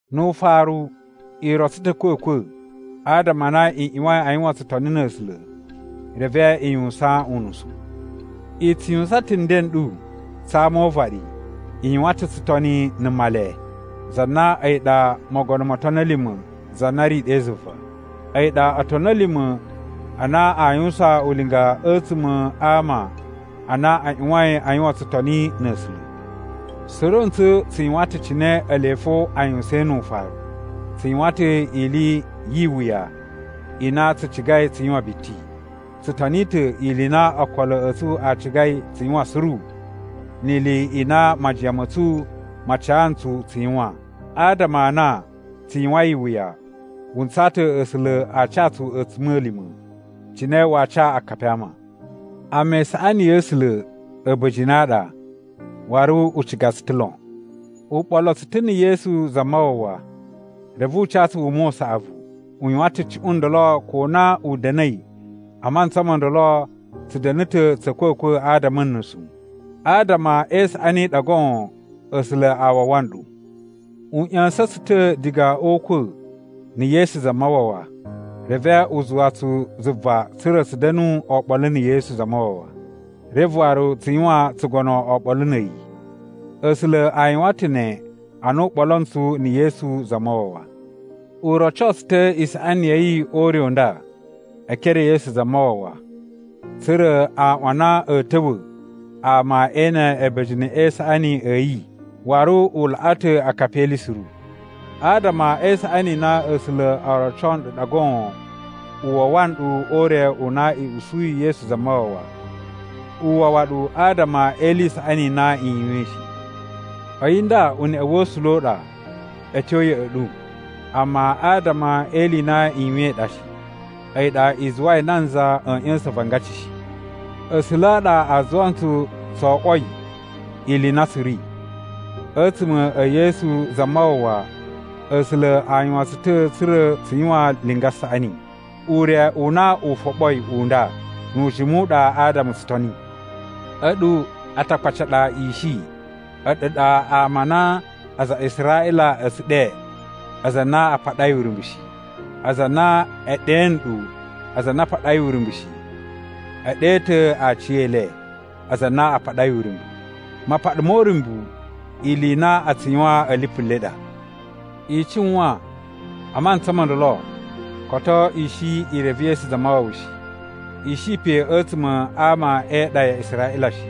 Nu ufaru, i rotso ta̱ a̱kwa̱kwa̱ adama a na i ꞌyuwain a yuwan tsutoni na̱ A̱sula̱ reve i yuwusan unusu. I tsu yuwusan ta̱ nden n ɗu tsa ama o uvaɗi. I yuwan ta̱ tsutoni na̱ Male, za na a̱yi ɗa mogono mo otoni a̱ lima̱ za na ri ɗe zuva. A̱yi ɗa otoni a̱ lima̱ a na aa yuwusan ulinga a̱tsuma̱ a ama a na a ꞌyuwain a yuwan tsutoni na̱ A̱sula̱. Suru ntsu tsu yuwan ta̱ cine ele fo a yuwusain nu ufaru. Tsu yuwan ta̱ ili yi iwuya i na tsu cigai tsu yuwan biti. Tsu toni ta̱ ili i na okolo a̱ tsu a cigai tsu yuwan suru ni ili i na majiyan ma̱ tsu ma ca ntsu tsu yuwan. Adama a na tsu yuwain iwuya wu ntsaa ta̱ A̱sula̱ a ca tsu a̱tsuma̱lima̱, cine waa ca akapi a ama. Amma isaꞌani ya̱ A̱sula̱ a̱ba̱jini a ɗa, waru u ciga tsu ta̱ lon. U ɓolo tsu ta̱ na̱ Yesu Zamawawa, reve u ca tsu wuma u saꞌavu. U yuwan ta̱ cuꞌun ndolo ko na u da̱na̱i a mantsa mo ndolo tsu da̱na̱ ta̱ tsa̱ a̱kwa̱kwa̱ adama a̱ nusu. Adama e isaꞌani i ɗa goon A̱sula̱ a wawa nɗu. U ꞌya̱sa̱n tsu ta̱ diga o ukwa̱ na̱ Yesu Zamawawa, reve u zuwa tsu zuva tsa̱ra̱ tsu da̱nu oɓolo na̱ Yesu Zamawawa, reve waru tsu yuwan tsugono oɓolo na̱ a̱yi. A̱sula̱ a yuwan ta̱ ne ana u ɓolo ntsu na̱ Yesu Zamawawa. U roco tsu ta̱ isaꞌani ya̱ yi o ure u nda e ekere e Yesu Zamawawa, tsa̱ra̱ a aꞌwan a na a̱a̱ ta̱wa̱ ama ee ene a̱ba̱jini e isaꞌani a̱ yi waru u laꞌa ta̱ akapi e ili suru. Adama e isaꞌani i na A̱sula̱ o roco nɗu ɗa goon u wawa nɗu o ure u na i usuyi Yesu Zamawawa. U wawa ɗu adama e ili i saꞌani i na i yuwain shi. A̱yi nda uneꞌe wa̱ A̱sula̱ u ɗa a̱ tyo ya̱ꞌa̱ ɗu, amma adama e ili i na i yuwain i ɗa shi. A̱yi ɗa i zuwai nanza a̱a̱ ꞌya̱sa̱n avangaci shi. A̱sula̱ a ɗa a zuwa ntsu tso oꞌwoi ili i na tsu ri. A̱tsuma̱ e Yesu Zamawawa, A̱sula̱ a yuwan tsu ta̱ tsa̱ra̱ tsu yuwan linga saꞌani. Ure u na u foɓoi u nda nu ujimu u ɗa adama tsu toni. A̱ɗu Atakpaci a ɗa i shi. A̱ɗu ɗa ama a na aza a Israꞌila a̱ tsu ɗe “aza a na a paɗai uryumbu shi.” Aza a na e ɗe nɗu “aza a na a paɗai uryumbu shi”, e ɗe ta̱ aciyele, “aza a na a paɗai uryumbu.” (Mapaɗa mo uryumbu ili i na a tsu yuwan a̱ lipu le ɗa.) I cuwan a mantsa mo ndolo, koto i shi i reve Yesu Zamawawa shi, i shi pe a̱tsuma̱ a ama e iɗa ya Israꞌila shi.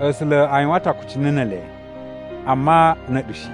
A̱sula̱ a yuwan ta̱ akucunu ne ele, amma na̱ a̱ɗu shi,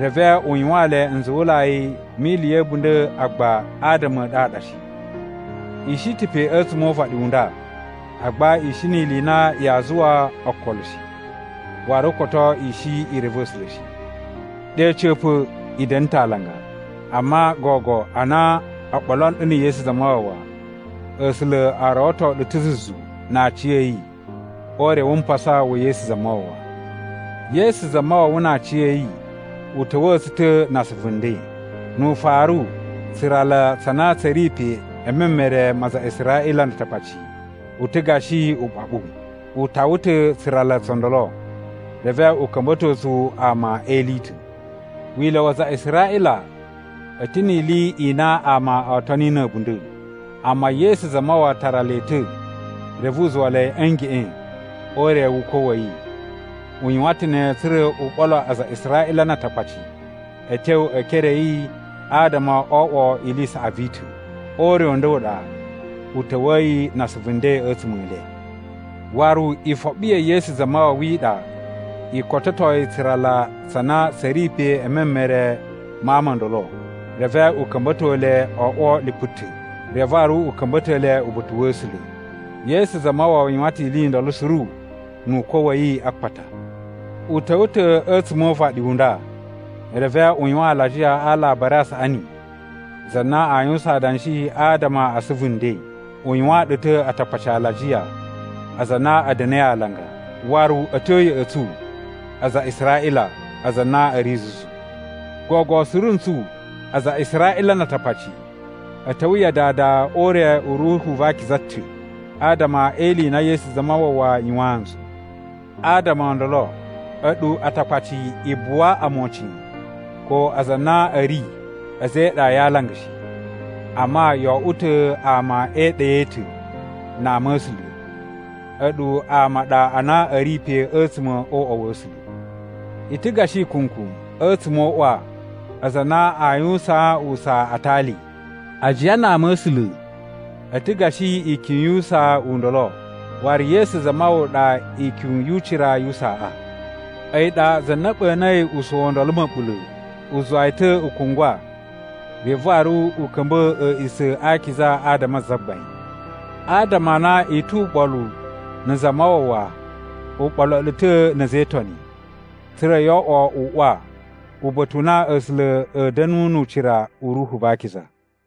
reve u yuwaan le nzuwulai mi ili ya̱ a̱bunda̱ agba adama a̱ ɗu a ɗa shi. I shi ta̱ pe a̱tsuma̱ o uvaɗi u nda agba i shi ni ili i na yaa zuwa okolo shi, waru koto i shi i reve A̱sula̱ shi. Ɗe a̱ca̱pa̱, i da̱na̱ ta̱ alanga, amma gogo a na o ɓolo nɗu na̱ Yesu Zamawawa, A̱sula̱ a rawato ɗu ta̱ zuzu na aciya̱yi o ure wu mpasa wa̱ Yesu Zamawawa. Yesu Zamawawa na aciya̱yi u ta̱wa̱a̱ tsu ta̱ na asuvu nden. Nu ufaru tsurala tsa na tsa̱ ri pe e memere ma aza a Israꞌila na Atakpaci u ta̱ gashi uɓaɓu. U tawa ta̱ tsurala tso ndolo, reve u ka̱mba̱to tsu ama e ili i ta̱. Wila̱ wa aza a Israꞌila a̱ ta̱ ni ili i na ama oo toni na̱ a̱bunda̱, amma Yesu Zamawawa tara le ta̱ reve u zuwa le a̱ ngeꞌen o ure wu ukwa̱ wa̱ yi. U yuwan ta̱ ne tsa̱ra̱ u ɓolo aza a Israꞌila na Atakpaci a̱ tyo e ekere a̱ yi adama o oꞌwo ili i saꞌavu i ta̱. O ure u nda u ɗa u ta̱wa̱yi na asuvu nden a̱tsuma̱ e le. Waru ifoɓi ya̱ Yesu Zamawawa i ɗa i kototoi tsurala tsa na tsa̱ ri pe e memere ma ama o ndolo. Reve u ka̱mba̱to le o oꞌwo lipu ta̱, reve waru u ka̱mba̱to le uba̱ta̱ wa̱ A̱sula̱. Yesu Zamawawa yuwan ta̱ ili i ndolo suru nu ukwa̱ wa̱ yi a akpata. U ta̱wa̱ ta̱ a̱tsuma̱ o uvaɗi u nda, reve u yuwan alajiya a Alabari a Saꞌani za na aa yuwusan adanshi adama a asuvu nden. U yuwaan ɗu ta̱ Atakpaci alajiya, aza a na a̱ da̱na̱i alanga, waru a̱ tyo ya̱ꞌa̱ tsu aza a Israꞌila, aza a na a̱ ri zuzu. Gogo suru ntsu, aza a Israꞌila na Atakpaci, a̱ ta̱wa̱ ya Dada o ure u Ruhu va Akiza ta̱ adama e ili i na Yesu Zamawawa yuwaan ntsu. Adama o ndolo, a̱ɗu Atakpaci, i buwa omocin ko aza a na a̱ ri a̱za̱ e iɗa ya alanga shi. Amma, yo oꞌwo ta̱ ama e iɗa i ta̱ na ama a̱ A̱sula̱. A̱ɗu ama a ɗa a na a̱ ri pe a̱tsuma̱ o uꞌwa wa̱ A̱sula̱. I ta̱ gashi ikunku a̱tsuma̱ o uꞌwa aza a na a yuwusaan usaa a atali. Ajiya na Ama̱sula̱ a̱ ta̱ gashi ikyun yu usaa u ndolo, waru Yesu Zamawawa ɗa ikyun yu ucira yu usaaꞌa. A̱yi ɗa za na ɓa̱na̱i usaa u ndolo ma̱ɓula̱. U zuwa yi ta̱ u kungwa reve waru u ka̱mba̱ a̱a̱ꞌisa̱ a akiza adama a Zagbain. Adama a na i tu uɓolu na̱ Zamawawa u ɓolo ɗu ta̱ na̱ a̱za̱ e Itoni, tsa̱ra̱ yo oꞌwo uꞌwa, uba̱ta̱ u na A̱sula̱ a̱a̱ da̱nu nu ucira u Ruhu va Akiza.